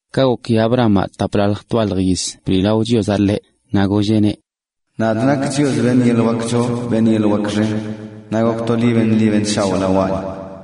Ka goki Abramaꞌ taplalj twalj yiz bliꞌlao Chiozaꞌ ḻeꞌ, naꞌ golleꞌneꞌ: ―Nadꞌ nakꞌ Chios, beṉꞌ yeḻꞌ wak choo beṉꞌ yeḻꞌ wak xen, naꞌ gok to beṉꞌ ḻi beṉꞌ shaoꞌ lawaꞌni.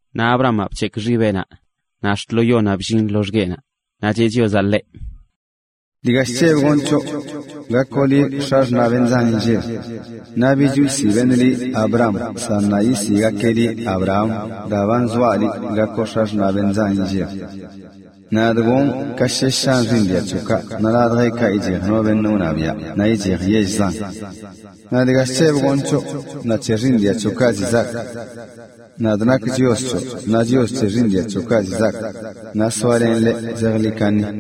Naꞌ Abramaꞌ bc̱hekꞌ xibeꞌnaꞌ, naꞌ ax̱t lo yonaꞌ bllin loxgueꞌnaꞌ, naꞌ cheꞌ Chiozaꞌ ḻeꞌ: ―Dga chc̱hebꞌ gonꞌ c̱hoꞌ: Gakoꞌ liꞌ x̱axṉaꞌ beṉꞌ zan inlleb. Naꞌ bich wsiꞌ beṉꞌ liꞌ Abram, san ṉaa yisiꞌgakeꞌ liꞌ Abraham daa ba nzoaꞌ liꞌ gakoꞌ x̱axṉaꞌ beṉꞌ zan inlleb. Nadꞌ gonꞌ ka shesh shan xiiṉ dia c̱hoꞌkaꞌ naꞌ ladjeꞌkaꞌ ichej no beṉꞌ wṉabiaꞌ naꞌ ichej yell zan. Naꞌ dga chc̱hebꞌ gonꞌ c̱hoꞌ naꞌ c̱he xiiṉ dia c̱hoꞌkaꞌ ziꞌ zaak: nadꞌ nakꞌ Chios c̱hoꞌ naꞌ Chios c̱he xiiṉ dia c̱hoꞌkaꞌ ziꞌ zaak, naꞌ soalenꞌ leꞌ zejḻi kaṉi.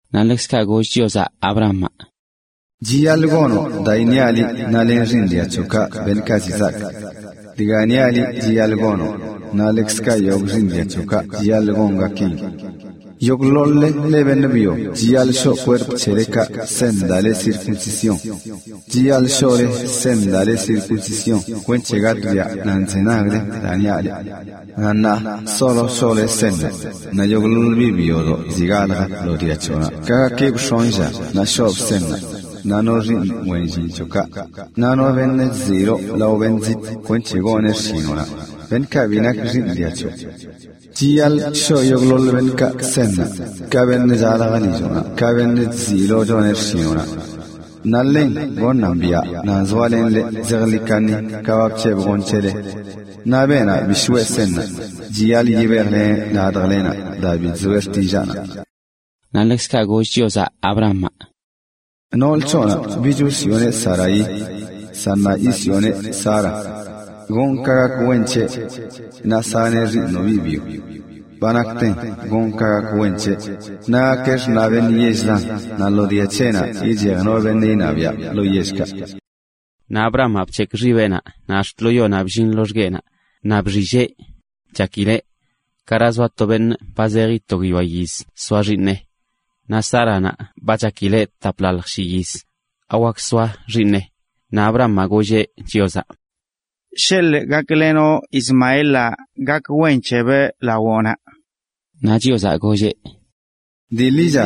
Naꞌ ḻekzkaꞌ goll Chiozaꞌ Abrahamaꞌ: ―Chiyaḻꞌ gonoꞌ daa iṉiaꞌ liꞌ naꞌ len xiiṉ dia c̱hoꞌkaꞌ beṉꞌkaꞌ ziꞌ zaak. Dga niaꞌ liꞌ chiyaḻꞌ gonoꞌn, naꞌ ḻekzkaꞌ yogꞌ xiiṉ dia c̱hoꞌkaꞌ chiyaḻꞌ gongakeꞌn: yogꞌḻoḻ-le leꞌ beṉꞌ byo chiyaḻꞌ shoꞌ kwerp c̱helekaꞌ seṉ daa le circuncisión. Chiyaḻꞌ shoꞌle seṉ daa le circuncisión kwenc̱he gatꞌbiaꞌ nan chzenagle daa niaꞌ leꞌ. Naꞌ ṉaa solo shoꞌle seṉnaꞌ, naꞌ yogꞌḻoḻ biꞌ byodoꞌ ziꞌ galjə lo dia c̱hoꞌnaꞌ ka gakibꞌ x̱onꞌ lla naꞌ shoobꞌ seṉnaꞌ, naꞌ no xiiṉ wen llin c̱hoꞌnaꞌ, naꞌ no beṉꞌ chziꞌyiloꞌ lao beṉꞌ zitꞌ kwenc̱he goneꞌ xshinoꞌnaꞌ, beṉꞌkaꞌ bi nak xiiṉ dia c̱hoꞌ. Chiyaḻꞌ shoꞌ yogꞌḻoḻ beṉꞌkaꞌ seṉnaꞌ, ka beṉꞌ chalj lilloꞌnaꞌ, ka beṉꞌ chziꞌyiloꞌ choneꞌ xshinoꞌnaꞌ. Naꞌ ḻen goṉan biaꞌ nan zoalenꞌ leꞌ zejḻi kaṉi ka ba bc̱hebꞌ gonꞌ c̱hele. Naꞌ beenaꞌ bi shoꞌe seṉnaꞌ, chiyaḻꞌ yibejleneꞌ ladjlenaꞌ daa bi chzoeꞌ xtillaanaꞌ. Naꞌ ḻekzkaꞌ goll Chiozaꞌ Abrahamaꞌ: ―Nool c̱hoꞌnaꞌ bich wsiꞌoneꞌ Saraí, san ṉaa yisiꞌoneꞌ Sara. Gonꞌ ka gak wen c̱heꞌ, naꞌ saneꞌ to xiiṉoꞌ biꞌ byo. Ba nakten gonꞌ ka gak wen c̱heꞌ, naꞌ gakeꞌ xṉaꞌ beṉꞌ yell zan naꞌ lo dia c̱heꞌnaꞌ ichej no beṉꞌ iṉabiaꞌ lo yellkaꞌ. Naꞌ Abrahamaꞌ bc̱hekꞌ xibeꞌnaꞌ naꞌ ax̱t lo yonaꞌ bllin loxgueꞌnaꞌ, naꞌ bxilleꞌ chakileꞌ: “¿Gara zoa to beṉꞌ ba zeji to guiyoa yiz soa xiiṉeꞌ? Naꞌ Sáranaꞌ ba gokileꞌ taplalj shi yiz, ¿awak soa xiiṉeꞌ?” Naꞌ Abrahamaꞌ golleꞌ Chiozaꞌ: ―Sheḻꞌ gaklenoꞌ Ismaelaꞌ gak wen c̱hebꞌ. Naꞌ Chiozaꞌ golleꞌ: ―Dii ḻicha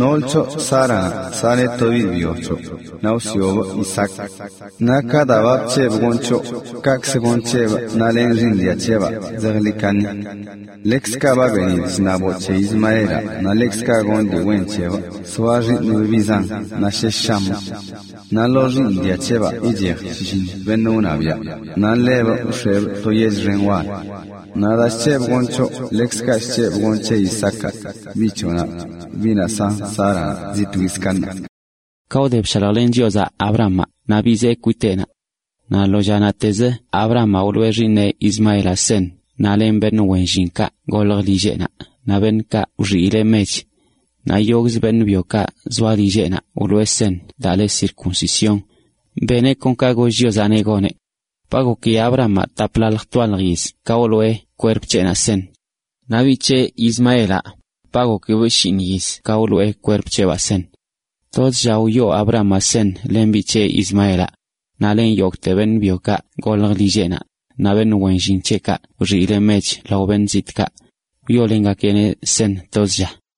nool c̱hoꞌ Sáranaꞌ saneꞌ to biꞌ byo c̱hoꞌ, naꞌ wsiꞌobꞌ Isaac, naꞌ ka daa ba bc̱hebꞌ gonꞌ c̱hoꞌ, kaꞌkzə gonꞌ c̱hebꞌ naꞌ len xiiṉ dia c̱hebaꞌ zejḻi kaṉi. Ḻekzkaꞌ ba benidꞌ chṉaboꞌ c̱he Ismaelaꞌ naꞌ ḻekzkaꞌ gonꞌ dii wen c̱hebꞌ soa xiiṉbꞌ biꞌ zan naꞌ shesh shamꞌ. Naꞌ lo xiiṉ dia c̱hebaꞌ ichej shlliṉ beṉꞌ wṉabiaꞌ, naꞌ ḻebꞌ wx̱ebꞌ to yell xen wal. Naꞌ daa bc̱hebꞌ gonꞌ c̱hoꞌ ḻekzkaꞌ chc̱hebꞌ gonꞌ c̱he Isaacaꞌ, biꞌ c̱hoꞌnaꞌ, biꞌnaꞌ san Sáranaꞌ zi twiz ka ṉaa. Ka wde bshaljlen Chiozaꞌ Abrahamaꞌ naꞌ bizee kwiteꞌnaꞌ. Naꞌ lo lla naꞌtezə Abrahamaꞌ wloꞌe xiiṉeꞌ Ismaelaꞌ seṉ naꞌ len beṉꞌ wen llinkaꞌ goljə lilleꞌnaꞌ naꞌ beṉꞌkaꞌ wxiileꞌ mech, naꞌ yogꞌzə beṉꞌ byokaꞌ zoa lilleꞌnaꞌ wloꞌe seṉ daa le circuncisión, beneꞌ kon ka goll Chiozaꞌneꞌ goneꞌ. Ba goki Abrahamaꞌ taplalj twalj yiz ka wloꞌe kwerp c̱heꞌnaꞌ seṉ. Naꞌ biꞌ c̱heꞌ, Ismaelaꞌ, ba gokibꞌ shiiṉ yiz ka wloꞌe kwerp c̱heꞌbaa seṉ. Tozə lla wyoꞌ Abrahamaꞌ seṉ len biꞌ c̱heꞌ Ismaelaꞌ, naꞌ len yogꞌte beṉꞌ byokaꞌ goljə lilleꞌnaꞌ, naꞌ beṉꞌ wen llin c̱heꞌkaꞌ wxiileꞌ mech lao beṉꞌ zitꞌkaꞌ, wyoolengakeꞌneꞌ seṉ toz lla.